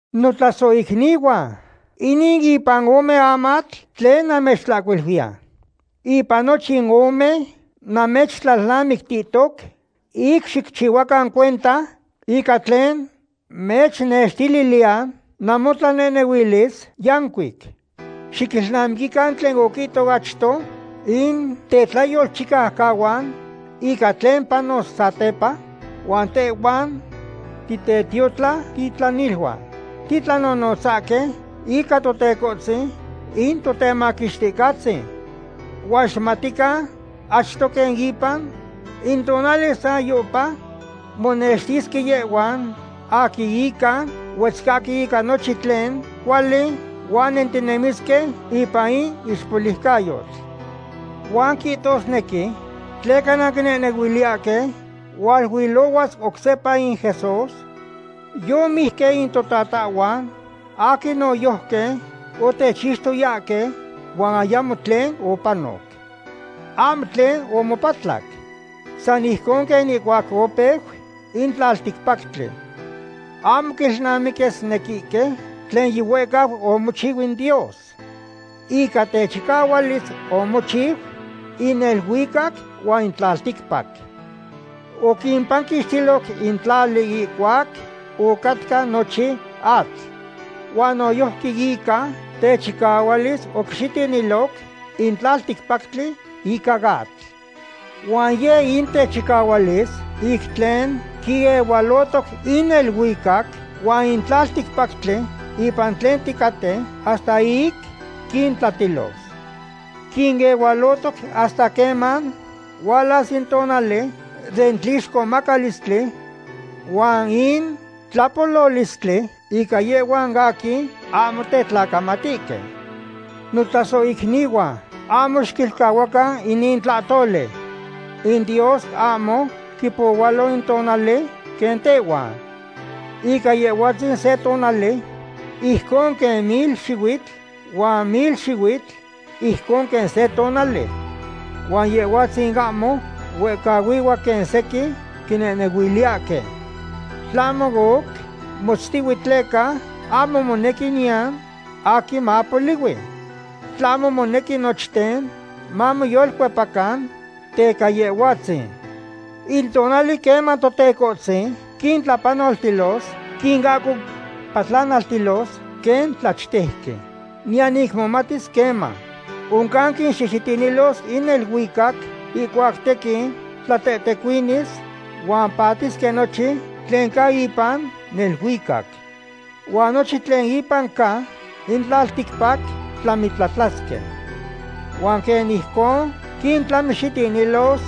Notlasohicnihuan, inin ipan ome amatl tlen namechihcuiluiya. Ipan nochin ome namechtlalnamictihtoc ic xicchihuacan cuenta ica tlen mechnextililiya namotlanehnehuilis yancuic. Xiquilnamiquican tlen oquihtohque achto in tetlayolchicaucahuan ica tlen panos satepa, huan tehhuan titetiotlatitlaniluan titlanonotzahque ica Totecohtzin in Totemaquixticahtzin. Huan xicmatican achto quen ipan in tonali sayohpa monextisque yehhuan aquin ica huetzcahque ica nochin tlen cuali huan nentinemisque ipan in ixpoliucayotl. Huan quihtosque: “¿Tleca nanquinehnehuiliyahque hualuilohuas oc sepa in Jesús? Yomijque in totatahhuan aquin noyojqui otechixtoyahque, huan ayamo tlen opanoc. Ahmo tlen omopatlac. San ijcon quen ihcuac opeu in tlalticpactli.” Ahmo quilnamiquisnequihque tlen yihuehcau omochiu in Dios. Ica techicahualis omochiu in neluicac huan in tlalticpac. Oquipanquixtiloc in tlali ihcuac ocatca nochin atl. Huan noyojqui ica techicahualis oquixitiniloc in tlalticpactli ica atl. Huan yeh in techicahualis ic tlen quinehualotoc in neluicac huan in tlalticpactli ipan tlen ticaten hasta ic quintlatilos. Quinehualotoc hasta queman hualas in tonali den tlixcomacalistli huan in tlapololistli ica yehhuan aquin ahmo tetlacamatihque. Notlasohicnihuan, ahmo xiquilcahuacan inin tlahtoli. In Dios ahmo quipohualo in tonali quen tehhuan. Ica Yehhuatzin se tonali ijcon quen mil xihuitl, huan mil xihuitl ijcon que se tonali. Huan Yehhuatzin ahmo huehcahuihua quen sequin quinehnehuiliyahque. Tlahmo oc motztihue tleca ahmo monequi niyan aquin mapolihui. Tlahmo monequi nochten mamoyolcuepacan teca Yehhuatzin. In tonali queman Totecohtzin quintlapanoltilos quinahcopatlanaltilos quen tlachtejqui. Niyan ic momatis queman. Oncan quixihxitinilos in neluicac ihcuac tequin tlatehtecuinis huan patisque nochin tlen ca ipan neluicac. Huan nochin tlen ipan ca in tlalticpac tlamitlatlasque. Huan quen ijcon quintlamixitinilos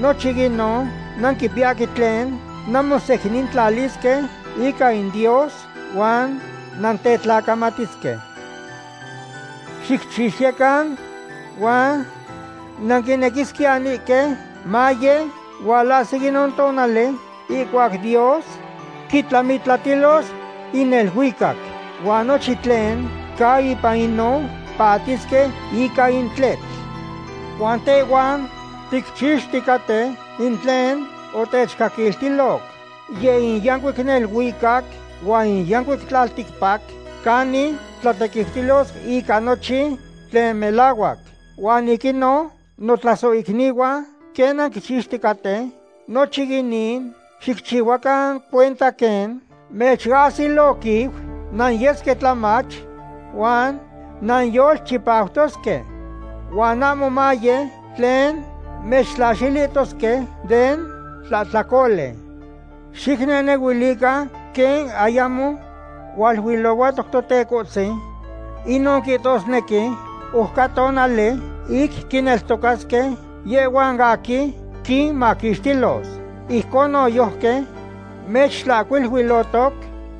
nochin inon, nanquipiyahque tlen nanmosecnintlalisque ica in Dios huan nantetlacamatisque. Xicchixtiyecan huan nanquinequisquiyanihque maye hualahsi inon tonali ihcuac Dios quitlamitlatilos in neluicac, huan nochin tlen ca ipan inon patisque ica in tletl. Huan tehhuan ticchixticaten in tlen otechcaquiltiloc. Yeh in yancuic neluicac huan in yancuic tlalticpac canin tlatequiutilos ica nochin tlen melahuac. Huan ic inon, notlasohicnihuan, quen nanquichixticaten nochin inin, xicchihuacan cuenta quen mechahsiloquiu nanyesque tlamach, huan nanyolchipautosque. Huan ahmo maye tlen mechtlaxilihtosque den tlahtlacoli. Xicnehnehuilican quen ayamo hualuilohuatoc Totecohtzin, inon quihtosnequi oc ca tonali ic quineltocasque yehhuan aquin quinmaquixtilos. Ijcon noyojqui mechtlahcuiluihtoc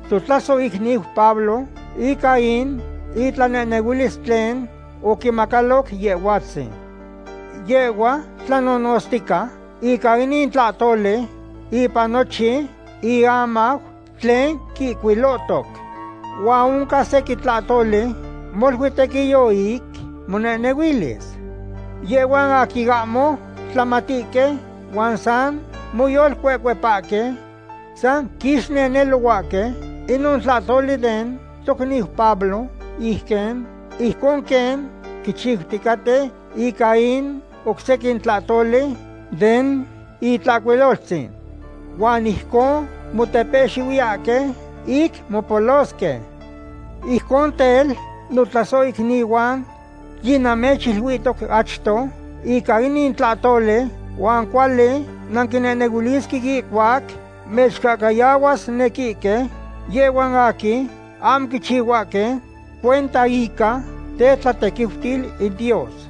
totlasohicniu Pablo ica in itlanehnehuilis tlen oquimacaloc Yehhuatzin. Yehhua tlanonotztica ica inin tlahtoli ipan nochin iamau tlen quihcuilohtoc. Huan oncan sequin tlahtoli molui tequiyo ic monehnehuilis. Yehhuan aquin ahmo tlamatihque huan san moyolcuecuepahque san quixnenelohuahque inon tlahtoli den tocniu Pablo ijcon quen quichiuticaten ica in oc sequin tlahtoli den Itlahcuiloltzin. Huan ijcon motepehxihuiyahque ic mopolosque. Ijcon tel, notlasohicnihuan, yinamechiluihtoc achto ica inin tlahtoli huan cuali nanquinehnehuilisque ihcuac mechcahcayahuasnequihque yehhuan aquin ahmo quichihuahque cuenta ica tetlatequiutil in Dios.